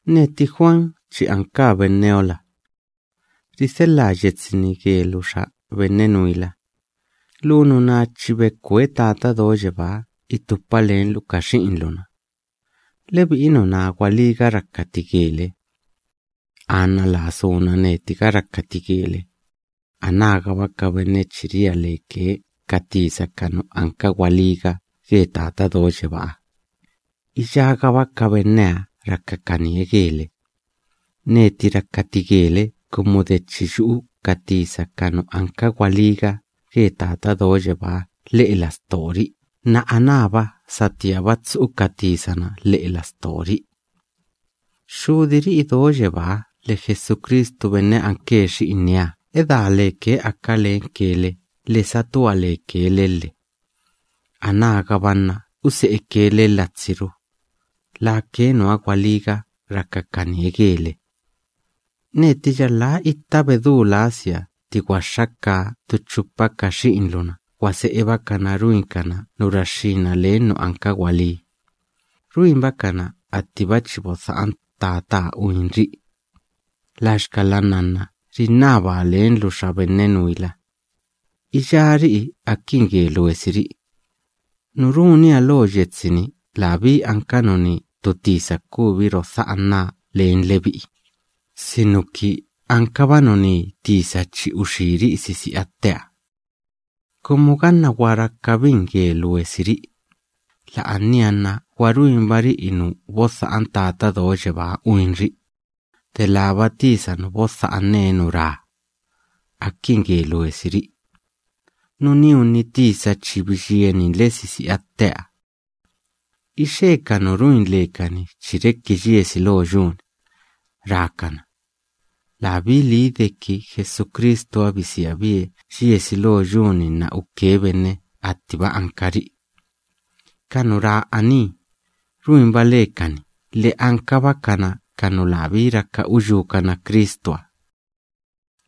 Neti Juan chi ankaa benneola. Ridhelhaa yetsi‑ni gelu xa benne nuila. Lu nuná chi bekwe Tata Do Yebáha itupa lenlu ka xi'inlu‑na. Lebi'i nuná gwalíga rakati gele. Anna laa suna netiga rakati gele, anágaba ka benne chi ria leke ka tisa ka nu ankakana gwalíga ge Tata Do Yebáha, iyágaba ka benneha rakakanie gele. Neti rakati gele kumu de chi yu'u ka tisa ka nu anka gwalíga ge Tata Do Yebáha lhe'e lastori'i nna anába satíaba tsu'u ka tisa‑na lhe'e lastori'i. Xxudiri'i do yebáha lhe Jesucristu benne anke Xi'inieha, lake edá leke aka lenke le lhe satua leke le lhe. Anágaba nna use'eke le latsiru. Lake nuha gwalíga rakakanie gele. Neti yalhá itta bedú lasia tti gwaxxakaa ttu chupa ka xi'inlu‑na gwa se'ebakana ruinkana nu raxxína len nu anka gwalí, ruinbakana attiba chi bodha'an Tataha uinri'i. Laxkala nnanna rinnabaa lenlu xa benne nuila, iyári'i akin ge luesiri'i. Nu runia lo yetsi‑ni labí anka nuní ttu tisa kubi rodha'anaa len lebi'i, sinuki ankaba nuní tisa chi uxíri'i sisi'a tteha. Kumu ganna gwa rakabin ge luesiri'i, la'ania nna gwa ruinbari'i nu bodha'an Tata Do Yebáha uinri'i, delába tisa nu bodha'ane nu ra: “Akin ge luesiri'i.” Nuníunni tisa chi biyieninle sisi'a tteha. Ixe ka nu ruin lekani chi reki yiesi lo yu‑ni, rákana: “Labí lii deki Jesucristuha bisiabie yiesi lo yu‑ni nna uke benne attiba ankari'i.” Ka nu ra aní, ruinba lekani lhe ankabakana ka nu labí raka uyúkana Cristuha.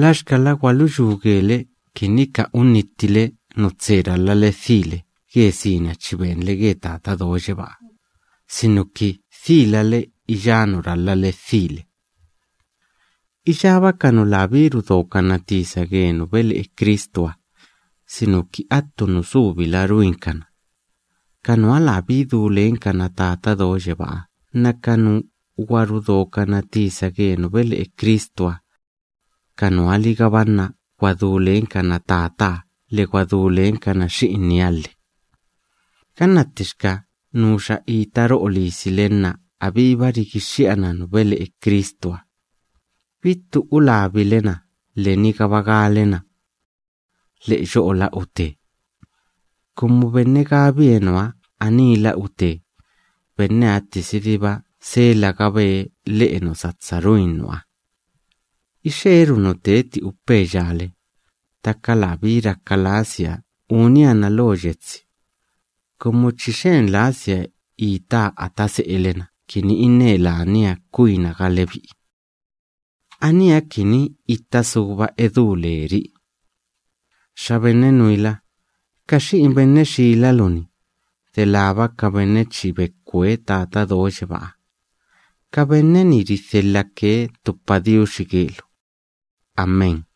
Laxkala gwaluyú gele kini ka unnittile nu tse ralhale dhile ge sina chi benle ge Tata Do Yebáha, sinuki dhílale iyá nu ralhale dhile. Iyába ka nu labí rudokana tisa ge nu bele'e Cristuha, sinuki attu nu subila ruinkana, ka nuha labí du lenkana Tata Do Yebáha nna ka nu gwa rudokana tisa ge nu bele'e Cristuha, ka nuha‑ligaba nna gwa du lenkana Tataha lhe gwa du lenkana Xi'inieha lhe. Ganna ttixka nuxa ita ro'o lisile nna abíba rigixxi'ana nu bele'e Cristuha, bittu ulabile na lhe nigaba gale na: “Lhe'e yo'ola ute.” Kumu benne gabie nuha: “Aníla ute”, benneha ttisidiba selagabe lhe'e nu satsa ruin nuha. Ixeeru nu teti upeya le, ttaka labí raka lasia unia na lo yetsi, kumu chi xen lasia itaa ata se'ele‑na kini inne lania kwinaga lebi'i. Aníha kini itta suba edú leri'i. Xa benne nuila, ka xi'in benne xilalu‑ni, delába ka benne chi bekwe Tata Do Yebáha, ka benne‑ni ridhelhake ttu padiuxi gelu. Amén.